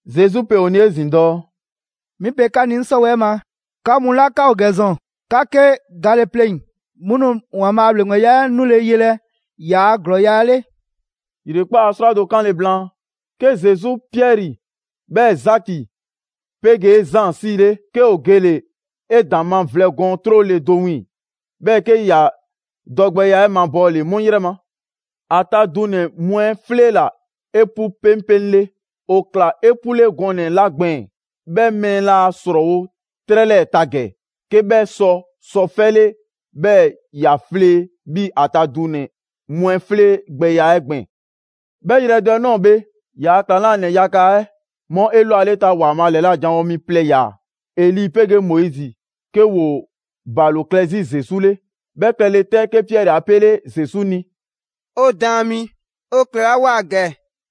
Zesu pe ‑o ni 'ezin‑ dɔɔ: «'Mi pe 'ka ni 'ŋ 'sɔwɛɛ‑ ma, 'ka mu 'la 'ka ‑o ‑gɛ ‑zɔn, 'ka 'ke gale pleŋ‑, 'mu nu ‑Waanbhaa' a ‑Bhleŋgbeya 'ɛ 'nule yelɛ ‑yaa' ‑glɔɔya' 'le.» ‑Yrekpaa' 'srwado‑ 'kanle‑ blaan, 'ke Zesu Piɛri 'bhɛɛ‑ Zaki 'pegee Zaan 'sile, 'ke ‑o gele‑ 'edaŋma vlɛ gɔɔn 'trole‑ do wiiŋ‑, 'bhɛɛ‑ 'ke ‑ya dɔgbɛya 'ɛ mabɔɔle 'mu 'yrɛ ma. ‑A ta dunɛ‑ mu 'ɛ 'fleela‑ 'epu 'peŋpeŋle. ‑O ꞊kla 'epule gɔnɛ‑ 'la gbɛɛn‑, 'bhɛ mɛɛ laa ‑srɔɔwo' 'trɛ 'lɛɛ‑ ta ‑gɛ 'ke 'bhɛ sɔ sɔ 'fɛle 'bhɛɛ‑ ‑ya flee 'bhii‑ ‑a ta dunɛ‑ mu 'ɛ 'fleegbɛya 'ɛ gbɛɛn‑. 'Bhɛ yrɛ do 'ɛ ꞊nɔɔ bhe, ‑yaa' ‑klaŋlanɛ yaga 'ɛ 'mu 'elwaleta ‑Waanbhaa' ‑lɛla' janwo mi plɛ ꞊ya, Eli 'pegee Moizi 'ke ‑woo ‑balo klɛ 'zi Zesu 'le. 'Bhɛ klɛle 'tɛ, 'ke Piɛri 'a 'pele Zesu ni: «'O Daan mi, 'o klɛlawoa ‑gɛ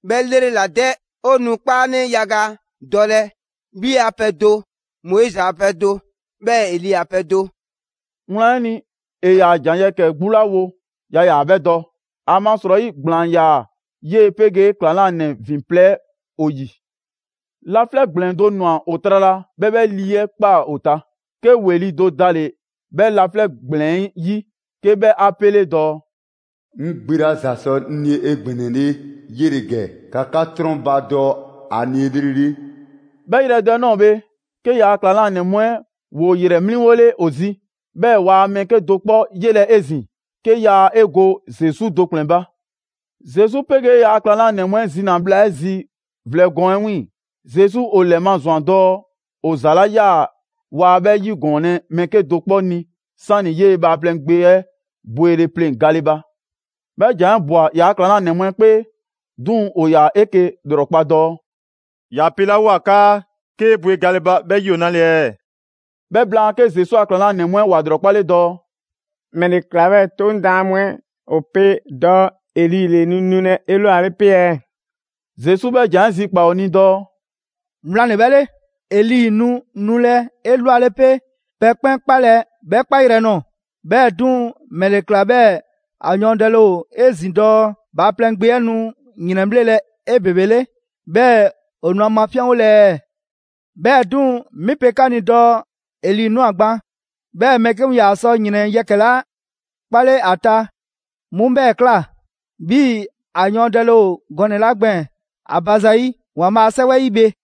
'bhɛ 'lrela‑ 'dɛ. 'O nu 'kpaanɛ yaga dɔlɛ, 'bhi a pɛ do, Moizi a pɛ do, 'bhɛɛ‑ Eli ‑a pɛ do.» Wlan 'ɛ ni, ‑e ‑yaa ‑jan yɛkɛ‑ 'gbu 'la wo, yaa ‑yaa 'bhɛ dɔ, ‑amasrɔyi ‑gblaan ‑yaa 'yee‑ 'pegee ‑klaŋlanɛ ‑vin plɛ 'ɛ ‑o ‑yi. Laflɛ' ‑gblɛn do ‑nwa ‑o trala, 'bhɛɛ‑ 'bhɛ lii 'ɛ ꞊kpaa ‑o ta. 'Ke ‑weli' do dale‑ 'bhɛ laflɛ' ‑gblɛn 'ɛ 'yi 'ke 'bhɛ 'a pele‑ dɔɔ: «'Ŋ Gbe 'la ‑za sɔ 'ŋ ni 'egbɛnɛle 'yele‑ ‑gɛ, ‑ka 'ka 'trɔnbadɔ ‑a ni 'elrele!» 'Bhɛ yrɛ do 'ɛ ꞊nɔɔ bhe, 'ke ‑yaa' ‑klaŋlanɛ mu 'ɛ ‑woo ‑yrɛ 'mliŋgole ‑o 'zi, 'bhɛɛ‑ waa mɛɛ 'kedo‑ 'kpɔ 'yelɛ‑ 'ezin‑, 'ke yaa 'e go Zesu do ‑kplɛn ba. Zesu 'pegee ‑yaa' ‑klaŋlanɛ mu 'ɛ zina‑ bhla 'ɛ zi vlɛ gɔɔn 'ɛ 'wiiŋ‑, Zesu ‑o ‑lɛmazwan dɔɔ ‑o ‑za 'la ꞊ya waa 'bhɛ 'yigɔɔnlɛ mɛɛ 'kedo‑ 'kpɔ ni 'sani‑ 'yee‑ Bhaaplɛŋ Gbe 'ɛ bwele pleŋ‑ gale ba. 'Bhɛ ‑jan 'ɛ ꞊bwa ‑yaa' ‑klaŋlanɛ mu 'ɛ 'kpee, 'duŋ‑ ‑o ‑yaa 'eke‑ ‑lrɔkpa dɔɔ: «‑Ya pelawoa 'kaa ‹'Kee‑ bwe gale›. 'Bhɛ 'yi ‑o 'nale‑ ɛɛ?» 'Bhɛ blaan, 'ke Zesu a ‑klaŋlanɛ mu 'ɛ ‑wa 'lrɔkpale dɔɔ: «‑Mɛle ‑kla 'bhɛɛ‑ 'Toŋ daan mu 'ɛ ‑o pe dɔɔ Eli ‑le nu nulɛ 'elwale 'pe ɛɛ?» Zesu 'bhɛ ‑jan 'ɛ zikpaa‑ ‑o ni dɔɔ: «Wlan ‑le 'bhɛ 'le, Eli nu nulɛ 'elwale 'pe pɛ 'kpɛn 'kpalɛ‑ 'bhɛ 'kpayrɛ‑ nɔɔ‑, 'bhɛɛ‑ 'duŋ‑ ‑mɛle ꞊kla 'bhɛɛ‑ ‑a yɔɔndɛle ‑o 'ezin‑ dɔɔ Bhaaplɛŋ Gbe 'ɛ nu ‑yrɛnbhlelɛ 'ebebele, 'bhɛɛ‑ ‑o nu ‑a mafinyanwolɛ ɛɛ? 'Bhɛɛ‑ 'duŋ‑, 'mi pe 'ka ni dɔɔ Eli ꞊nwa gban, 'bhɛɛ‑ mɛɛ 'ke mu ‑yaa sɔ ‑yrɛn yɛkɛ‑ 'la 'kpale ‑a ta 'mu 'bhɛɛ‑ ꞊kla, 'bhii‑ ‑a yɔɔndɛle ‑o gɔnɛ‑ 'la gbɛɛn‑ ‑a ba zayi' ‑Waanbhaa' a 'Sɛwɛ 'ɛ 'yi bhe.»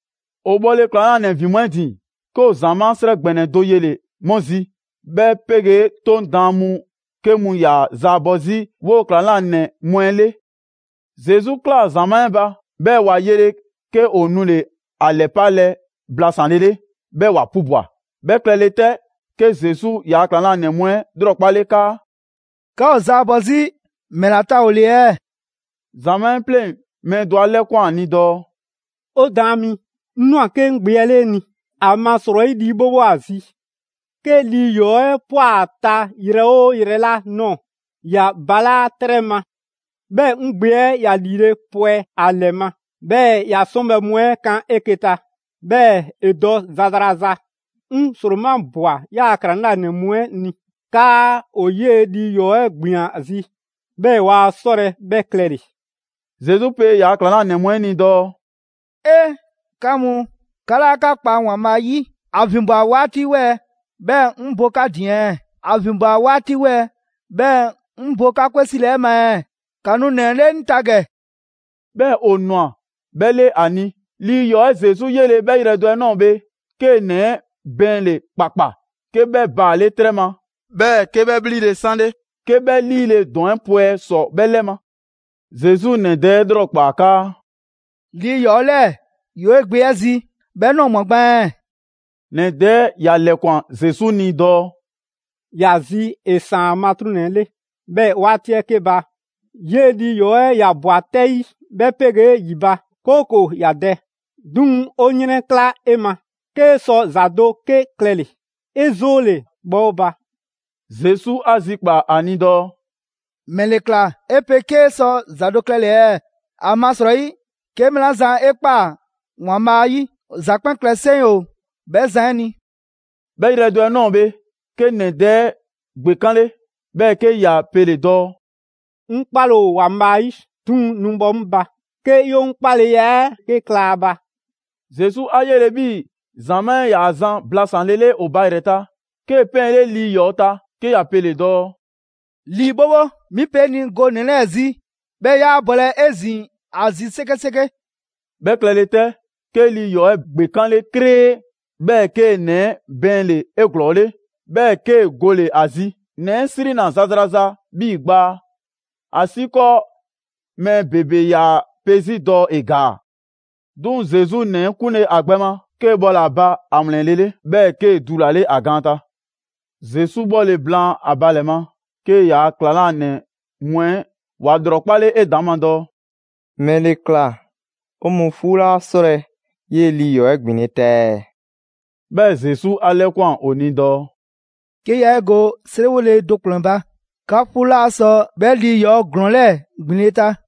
‑O bhɔle ‑klaŋlanɛ ‑vin mu 'ɛ ‑din, 'ke ‑o ‑zamaa' 'srɛ ‑gbɛnɛ do yele‑ 'mu zi, 'bhɛ 'pegee 'Toŋ daan mu 'ke mu ‑yaa zaabɔ 'zi 'woo‑ ‑klaŋlanɛ mu 'ɛ 'le. Zesu ꞊klaa ‑zamaa' 'ɛ ba, 'bhɛɛ‑ ‑wa yele, 'ke ‑o nule‑ ‑a ‑lɛpalɛ blasanlele, 'bhɛɛ‑ ‑wa 'pubwa‑. 'Bhɛ klɛle 'tɛ, 'ke Zesu yaa ‑klaŋlanɛ mu 'ɛ ‑lrɔkpale 'kaa: «'Ka ‑o zaabɔ 'zi ‑mɛla ta ‑o ‑le ɛɛ?» ‑Zamaa' 'ɛ 'pleŋ mɛɛ do 'a 'lɛkwan‑ ni dɔɔ: «'O Daan mi, 'ŋ ꞊nwa 'ke 'ŋ gbe 'ɛ 'le 'e ni, ‑amasrɔyi lii 'bhobho ‑o ‑a zi. 'Ke lii ‑yɔɔ' 'ɛ ꞊pwa 'a ta yrɛ 'oo yrɛ 'la ꞊nɔɔ, ‑ya balaa' 'trɛ ma, 'bhɛɛ‑ 'ŋ gbe 'ɛ ‑ya ‑liile' pwɛ ‑a ‑lɛ ma, 'bhɛɛ‑ ‑ya 'sɔnbhɛ‑ mu 'ɛ kan 'eke‑ ta, 'bhɛɛ‑ ‑e dɔ zazraza. 'Ŋ 'sromabwa 'yaa‑ ‑klaŋlanɛ mu 'ɛ ni 'kaa ‑o 'yee‑ lii ‑yɔɔ' 'ɛ ‑gbin ‑a zi, 'bhɛɛ‑ waa 'sɔlɛ‑ 'bhɛ klɛle‑.» Zesu pe ‑yaa' ‑klaŋlanɛ mu 'ɛ ni dɔɔ: «'Ee! 'Ka mu, 'ka 'laa 'ka kpa ‑Waanbhaa' 'yi! ‑A ‑vinbwa 'waati 'wɛɛ‑ 'bhɛɛ‑ 'ŋ bo 'ka ‑din ɛɛ? ‑A ‑vinbwa 'waati 'wɛɛ‑ 'bhɛɛ‑ 'ŋ bo 'ka 'kwe 'sile‑ 'ɛ ma ɛɛ? ‑Ka nu ‑nɛ 'ɛ 'le 'ŋ ta ‑gɛ!» 'Bhɛɛ‑ ‑o ꞊nwa 'bhɛ 'le ‑a ni. Lii ‑yɔɔ' 'ɛ Zesu 'yele‑, 'bhɛ yrɛ do 'ɛ ꞊nɔɔ bhe, 'kee‑ ‑nɛ 'ɛ bɛɛnle‑ ‑kpakpa, 'ke 'bhɛ baale' 'trɛ ma, 'bhɛɛ‑ 'ke 'bhɛ ‑bhlile' 'sanle 'ke 'bhɛ 'liile‑ ‑dɔn 'ɛ pwɛ ‑sɔ 'bhɛ 'lɛ ma. Zesu ‑nɛ dɛ 'ɛ ‑lrɔkpaa 'kaa: «Lii ‑yɔɔ' 'lɛɛ‑ ‑yoo 'e gbe 'ɛ zi 'bhɛ ꞊nɔɔ ꞊mwa gban ɛɛ?» ‑Nɛ dɛ 'ɛ ‑ya ‑lɛkwan Zesu ni dɔɔ: «‑Ya zi ‑e 'san 'a matruŋnɛ 'le. 'Bhɛɛ‑ 'waati 'ɛ 'ke ba, 'yee‑ lii ‑yɔɔ' 'ɛ ‑ya ꞊bwa 'tɛ 'yi 'bhɛ 'pegee ‑yi ba, 'kooko‑ ‑ya dɛ. 'Duŋ‑, 'o 'yrɛnkla 'e ma, 'kee sɔ ‑za do 'ke klɛle‑, 'e 'zoole‑, bhɔ 'o ba!» Zesu 'a zikpaa‑ ‑a ni dɔɔ: «‑Mɛle ꞊kla 'e pe 'kee sɔ ‑za do klɛle‑ ɛɛ? ‑Amasrɔyi 'ke mɛɛ 'la zan 'e ꞊kpaa ‑Waanbhaa' 'yi, ‑za 'kpɛn klɛ 'seŋ ‑o 'bhɛ zan 'ɛ ni.» 'Bhɛ yrɛ do 'ɛ ꞊nɔɔ bhe, 'ke ‑nɛ dɛ 'ɛ ‑gbekanle, 'bhɛɛ‑ 'ke ‑ya pele‑ dɔɔ: «'Ŋ 'kpale‑ ‑o ‑Waanbhaa' 'yi, 'duŋ‑ nu bhɔ 'ŋ ba 'ke 'ye 'ŋ 'kpaleya 'ɛ 'ke kla a ba!» Zesu 'a 'yele‑ 'bhii‑ ‑zamaa' 'ɛ 'yaa‑ zan blasanlele ‑o ba ‑yrɛ ta, 'kee‑ 'pɛɛnle lii ‑yɔɔ' ta 'ke ‑ya pele‑ dɔɔ: «Lii 'bhobho, 'mi pe 'e ni go ‑nɛ 'lɛɛ‑ zi, 'bhɛɛ‑ 'yaa bɔlɛ 'ezin‑ ‑a zi 'sekeseke.» 'Bhɛ klɛle 'tɛ, 'ke lii ‑yɔɔ' 'ɛ ‑gbekanle 'kree, 'bhɛɛ‑ 'kee‑ ‑nɛ 'ɛ bɛɛnle‑ 'eglɔɔle, 'bhɛɛ‑ 'kee‑ gole‑ ‑a zi. ‑Nɛ 'ɛ 'srinna‑ zazraza 'bhii gbaa, ‑asiikɔɔ mɛɛ ‑bebe ‑yaa pe 'zi dɔɔ ‑e ‑gaa. 'Duŋ‑ Zesu ‑nɛ 'ɛ 'kunle ‑a gbɛ ma, 'kee‑ bhɔle‑ ‑a ba ‑a ‑wlɛnlele, 'bhɛɛ‑ 'kee‑ dulale ‑a gaan ta. Zesu 'bhɔle‑ blaan ‑a ba ‑lɛ ma, 'ke ‑yaa' ‑klaŋlanɛ mu 'ɛ ‑wa ‑lrɔkpale 'edaŋma dɔɔ: «‑Mɛle ꞊kla 'o mɔɔ 'fuu 'laa 'sɔlɛ‑ 'yee‑ lii ‑yɔɔ' 'ɛ ‑gbinle' ta ɛɛ?» 'Bhɛɛ‑ Zesu 'a 'lɛkwan‑ ‑o ni dɔɔ: «'Ke yaa 'e go 'seriwole do ‑kplɛn ba, 'ka 'fuu 'laa sɔ 'bhɛ lii ‑yɔɔ' ‑glɔɔn 'lɛɛ‑ ‑gbinle' ta.»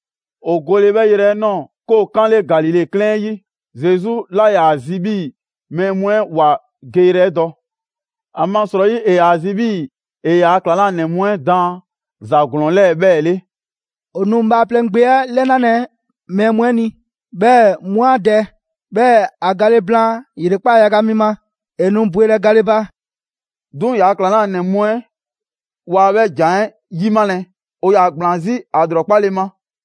‑O gole 'bhɛ 'yrɛ 'ɛ ꞊nɔɔ, 'ke ‑o 'kanle Galile 'klɛɛn 'ɛ 'yi. Zesu 'laa ‑yaa ‑a zi 'bhii‑ mɛɛ mu 'ɛ ‑wa geyrɛ dɔ. ‑Amasrɔyi, ‑e ‑yaa ‑a zi 'bhii‑ ‑e ‑yaa' ‑klaŋlanɛ mu 'ɛ daan ‑za ‑glɔɔn 'lɛɛ‑ 'bhɛɛ‑ 'le: «‑O nu Bhaaplɛŋ Gbe 'ɛ 'lɛnalɛ mɛɛ mu 'ɛ ni, 'bhɛɛ‑ 'mu 'a dɛ, 'bhɛɛ‑ ‑a gale blaan ‑yrekpaa' yaga mi ma, ‑e nu bwelɛ gale ba.» 'Duŋ‑ ‑yaa' ‑klaŋlanɛ mu 'ɛ waa 'bhɛ ‑jan 'ɛ 'yimalɛ, ‑o ‑yaa ‑gblaan 'zi ‑a ‑lrɔkpale ma.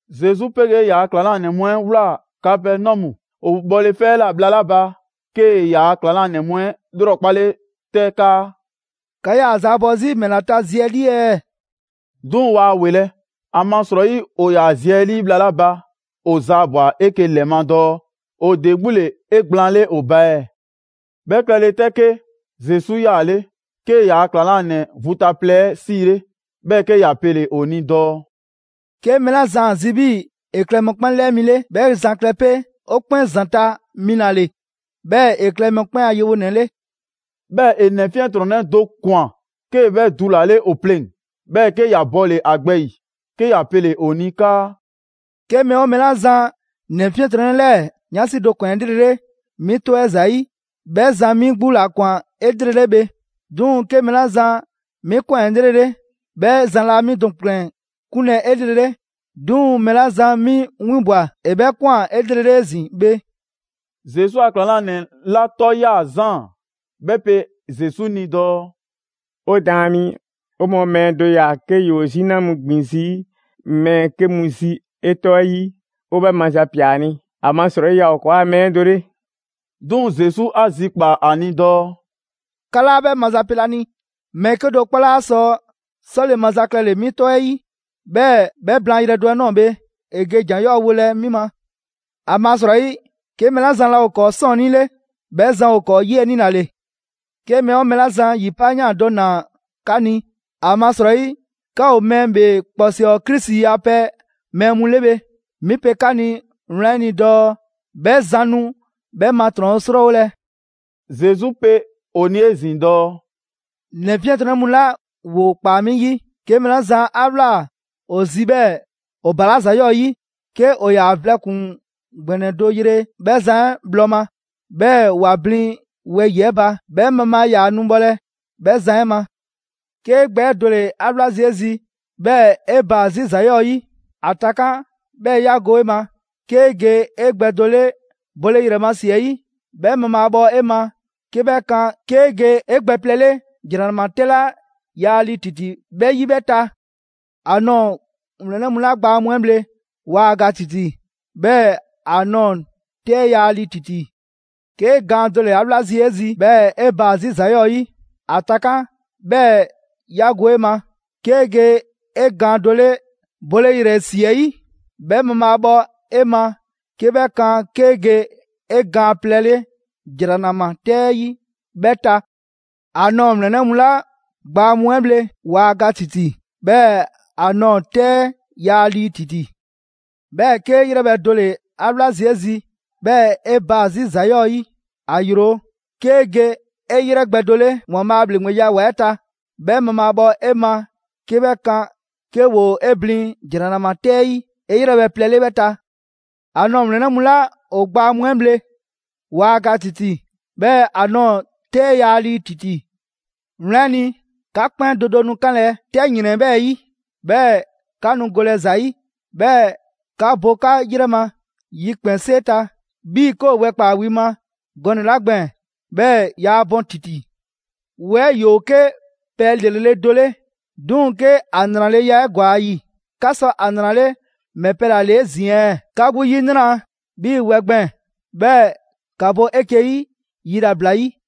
Zesu 'pegee ‑yaa' klaŋlanɛ mu 'ɛ ꞊wlaa Kapɛnɔmu. ‑O bhɔle 'fɛ 'ɛ ꞊la bhla 'la ba, 'kee‑ ‑yaa' ‑klaŋlanɛ mu 'ɛ ‑lrɔkpale 'tɛ 'kaa: «'Ka ‑yaa zaabɔ 'zi ‑mɛla ta zi 'ɛ 'lii ɛɛ?» 'Duŋ‑ waa ‑welɛ'. ‑Amasrɔyi, ‑o ‑yaa zi 'ɛ 'lii bhla 'la ba ‑o zaabwa‑ 'eke‑ ‑lɛ ma dɔɔ ‑o ‑de 'gbu ‑le 'egblaanle ‑o ba ɛɛ. 'Bhɛ klɛ le 'tɛ 'ke, Zesu 'yaale, 'kee‑ ‑yaa' ‑klaŋlanɛ vu ta plɛ 'ɛ 'siile, 'bhɛɛ‑ 'ke ‑ya pele‑ ‑o ni dɔɔ: «'Ke mɛɛ 'la zan ‑a zi 'bhii‑ ‑e klɛ mɔkpɛn' 'lɛɛ mi 'le, 'bhɛ zan klɛ 'pe ‑o 'kpɛn ‑zanta' mi ‑la ‑le, 'bhɛɛ‑ ‑e klɛ mɔkpɛn' a yewonɛ 'le.» 'Bhɛɛ‑ ‑e ‑nɛ 'fiɛntrɔnnɛ do ꞊kwan, 'kee‑ 'bhɛ dulale ‑o pleŋ‑, 'bhɛɛ‑ 'ke ‑ya bɔle‑ ‑a gbɛ 'yi, 'ke ‑ya pele‑ ‑o ni 'kaa: «'Ke mɛɛ ‑o mɛɛ 'la zan ‑nɛ 'fiɛntrɔnnɛ 'lɛɛ‑ 'yansi do ꞊kwan 'elrele 'mi 'tɔ 'ɛ ‑zayi', 'bhɛ zan 'mi 'gbu ‑la ꞊kwan 'elrele bhe. 'Duŋ‑ 'ke mɛɛ 'la zan 'mi ꞊kwan 'elrele, 'bhɛ zan laa 'mi do ‑kplɛn 'kunlɛ‑ 'elrele, 'duŋ‑ mɛɛ 'la zan 'mi 'winbwa‑ ‑e 'bhɛɛ‑ ꞊kwan 'elrele 'ezin‑ bhe.» Zesu a ‑klaŋlanɛ 'la 'tɔ 'yaa Zaan, 'bhɛ pe Zesu ni dɔɔ: «'O Daan mi, 'o mɔɔ mɛɛ do ꞊ya 'ke ‑yoo 'zina mu ‑gbin 'zi mɛɛ 'ke mu zi 'e 'tɔ 'ɛ 'yi. 'O 'bhɛ mazapia ‑a ni, ‑amasrɔyi yaa ‑o ‑kɔɔa' mɛɛ 'ɛ do 'le.» 'Duŋ‑, Zesu 'a zikpaa‑ ‑a ni dɔɔ: «'Ka 'laa 'bhɛ mazapelɛ ‑a ni, mɛɛ 'kedo‑ 'kpɔ 'laa sɔ 'sɔle‑ maza klɛle‑ 'mi 'tɔ 'ɛ 'yi, 'bhɛɛ‑ 'bhɛ blaan yrɛ do 'ɛ ꞊nɔɔ bhe, ‑e ge ‑jan 'yɔɔ‑ wolɛ 'mi ma. ‑Amasrɔyi, 'ke mɛɛ 'la zan laa ‑o ‑kɔɔ' 'sɔɔnnii 'le, 'bhɛ zan ‑o ‑kɔɔ' 'yiɛnii ‑la ‑le. 'Ke mɛɛ 'oo mɛɛ 'la zan ‑yi 'paayan꞊ do ꞊naa 'ka ni, ‑amasrɔyi 'ka ‑o Mɛɛ ‑Bhee ‑Kpɔsɔɔ Krisi a pɛ mɛɛ mu 'le bhe, 'mi pe 'ka ni wlan 'ɛ ni dɔɔ 'bhɛ zan nu 'bhɛ ma ‑trɔn 'srɔɔwolɛ.» Zesu pe ‑o ni 'ezin‑ dɔɔ: «‑Nɛ 'fiɛntrɔnnɛ mu 'la ‑woo ꞊kpaa 'mi 'yi, 'ke mɛɛ 'la zan 'a ꞊wlaa ‑o zi 'bhɛɛ‑ ‑o ‑balaa' ‑za 'yɔɔ 'yi, 'ke ‑o ‑yaa vlɛ ‑kpuŋ ‑gbɛnɛ do yre 'bhɛ zan 'ɛ bhlɔ ma, 'bhɛɛ‑ ‑wa blin wɛyi‑ 'ɛ ba, 'bhɛ mabhaa yaa nu bhɔlɛ bhɛ zan 'ɛ ma. 'Kee gbɛ 'ɛ do ‑le 'a 'wla zii' 'e zi 'bhɛɛ‑ 'e baa‑ 'zi ‑za 'yɔɔ‑ 'yi, ‑a takan', 'bhɛɛ‑ 'ya go 'e ma. 'Kee ge 'e gbɛ do 'le bole ‑yrɛ ma ‑si 'ɛ 'yi, 'bhɛ mabhaabhɔ 'e ma 'ke 'bhɛ kan 'kee ge 'e gbɛ plɛ 'le ‑jranama 'tɛ 'la yaa lii ‑titi 'bhɛ 'yi 'bhɛ ta. [‑A nɔɔ‑ ‑wlɛnnɛ' mu 'la gbaa mu 'ɛ bhle, waa ga ‑titi, 'bhɛɛ‑ ‑a ꞊nɔɔ 'tɛ 'ɛ yaa lii ‑titi. 'Kee gaan do ‑le 'a 'wla zii' 'e zi 'bhɛɛ‑ 'e baa‑ 'zi ‑za 'yɔɔ‑ 'yi, ‑a takan' 'bhɛɛ‑ 'ya go 'e ma. 'Kee ge 'e gaan do 'le bole ‑yrɛ ‑si 'ɛ 'yi, 'bhɛ mabhaabhɔ 'e ma 'ke 'bhɛ 'kan 'kee ge 'e gaan plɛ 'le ‑jranama 'tɛ 'ɛ 'yi 'bhɛ ta. ‑A nɔɔ‑ ‑wlɛnnɛ' mu 'la gbaa mu 'ɛ bhle, waa ga ‑titi, 'bhɛɛ‑ ‑a ꞊nɔɔ 'tɛ 'ɛ yaa lii ‑titi.»] «'Bhɛɛ‑ 'kee 'yrɛbhɛ‑ do ‑le 'a wla zii' 'e zi 'bhɛɛ 'e baa‑ 'zi ‑za 'yɔɔ‑ 'yi, ‑a yro. 'Kee‑ ge 'e 'yrɛ gbɛ do 'le ‑Waanbhaa' a ‑Bhleŋgbeya ‑wa 'ɛ ta, 'bhɛ mabhaabhɔ 'e ma 'ke 'bhɛ kan 'ke ‑woo 'e blin ‑jranama 'tɛ 'ɛ 'yi 'e 'yrɛbhɛ plɛ 'le 'bhɛ ta. [‑A nɔɔ‑ ‑wlɛnnɛ' mu 'la ‑o gbaa mu 'ɛ mu 'ɛ bhle, waa ga ‑titi, 'bhɛɛ‑ ‑a ꞊nɔɔ 'tɛ 'ɛ yaa lii ‑titi.] Wlan 'ɛ ni, 'ka 'kpɛn do do nu 'kanlɛ‑ 'tɛ ‑yrɛn 'ɛ 'bhɛɛ‑ 'yi, 'bhɛɛ‑ 'ka nu golɛ ‑za ‑yi, 'bhɛɛ‑ 'ka bo 'ka ‑yrɛ ma yikpɛnsee ta 'bhii‑ 'ke ‑o wɛ ꞊kpaa wi ma gɔnɛ‑ 'la gbɛɛn‑, 'bhɛɛ‑ yaa bɔn ‑titi.» «Wɛ 'ɛ ‑yoo 'ke pɛ ‑lrele' do 'le, 'duŋ‑ 'ke ‑a ‑nraleya 'ɛ ‑gwa ‑a ‑yi, 'ka sɔ ‑a ‑nrale' ‑mɛ pɛ ‑la ‑le 'ezin‑ ɛɛ? 'Ka 'gbu 'yinra‑ 'bhii‑ wɛ gbɛɛn‑, 'bhɛɛ‑ ‑ka bo 'eke‑ 'yi yilabla 'yi.»